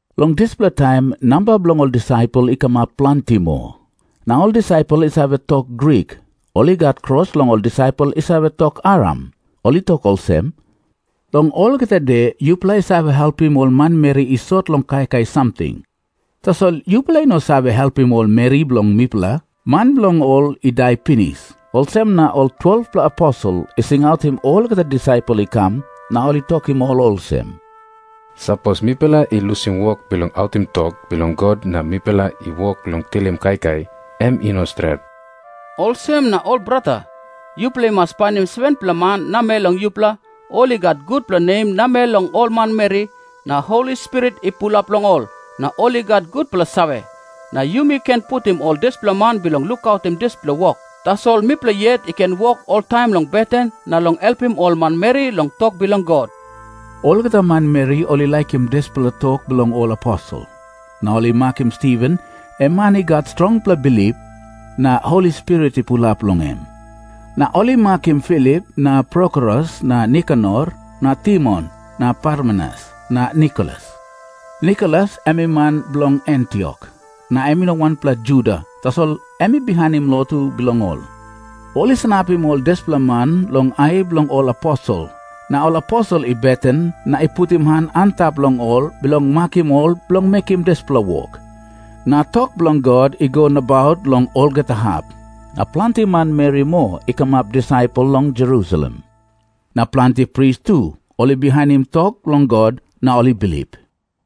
Long dispela taim namba bilong ol disaipel i kamap planti moa. Na ol disaipel i save tok Grik, ol i gat kros long ol disaipel i save tok Aram. Ol i tok olsem, "Long olgeta de yupela i save helpim ol manmeri i sot long kaikai samting, tasol yupela i no save helpim ol meri bilong mipela, man bilong ol i dai pinis." Olsem na ol 12-pela aposel i singautim olgeta disaipel i kam, na ol i tokim ol olsem, "Sapos mipela i lusim wok bilong autim tok bilong God na mipela i wok long tilim kaikai, em i no stret. Olsem na ol brata, yupela i mas painim 7-pela man namel long yupela, ol i gat gutpela nem namel long ol manmeri, na Holi Spirit i pulap long ol, na ol i gat gutpela save. Na yumi ken putim ol dispela man bilong lukautim dispela wok. Tasol mipela yet i ken wok oltaim long beten na long helpim ol manmeri long tok bilong God." Olgeta manmeri ol i laikim dispela tok bilong ol aposel. Na ol i makim Stiven, em man i gat strongpela bilip, na Holi Spirit i pulap long em. Na ol i makim Filip na Prokorus na Nikanor na Timon na Parmenas na Nikolas. Nikolas em i man bilong Antiok, na em i no wanpela Juda, tasol em i bihainim lotu bilong ol. Ol i sanapim ol dispela man long ai bilong ol aposel, na ol aposel i beten na i putim han antap long ol bilong makim ol bilong mekim dispela wok. Na tok bilong God i go nabaut long olgeta hap. Na planti manmeri moa i kamap disaipel long Jerusalem. Na planti pris tu ol i bihainim tok bilong God na ol i bilip.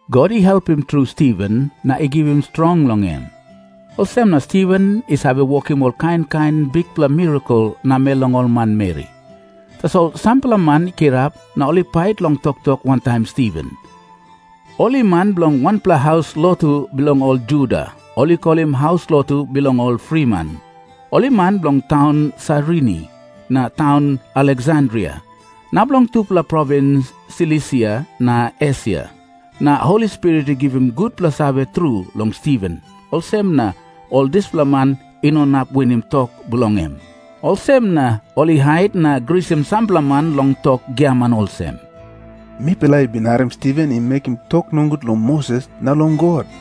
God i helpim tru Stiven na i givim strong long em, olsem na Stiven i save wokim ol kain kain bikpela mirakel namel long ol manmeri. Tasol sampela man i kirap na ol i pait long toktok wantaim Stiven. Ol i man bilong wanpela haus lotu bilong ol Juda, ol i kolim haus lotu bilong ol friman. Ol i man bilong taun Sairini na taun Aleksandria na bilong tupela provins Silisia na Esia. Na Holi Spirit i givim gutpela save tru long Stiven, olsem na ol dispela man i no inap winim tok bilong em. Olsem na ol i hait na grisim sampela man long tok giaman olsem, "Mipela i bin harim Stiven i mekim tok nogut long Moses na long God."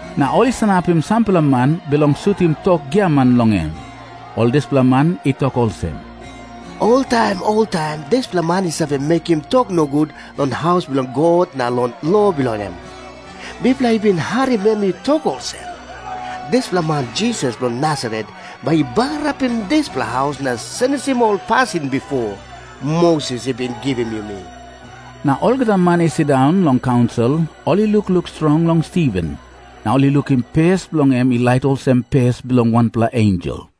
Na ol i sanapim sampela man bilong sutim tok giaman long em. Ol dispela man i tok olsem, "Oltaim oltaim dispela man i save mekim tok nogut long haus bilong God na long lo bilong em. Mipela i bin harim em i tok olsem, 'Dispela man Jisas bilong Nasaret bai i bagarapim dispela haus na senisim ol pasin bipo Moses i bin givim yumi.' " Na olgeta man i sindaun long kaunsil, ol i lukluk strong long Stiven, na ol i lukim pes bilong en i lait olsem pes bilong wanpela ensel.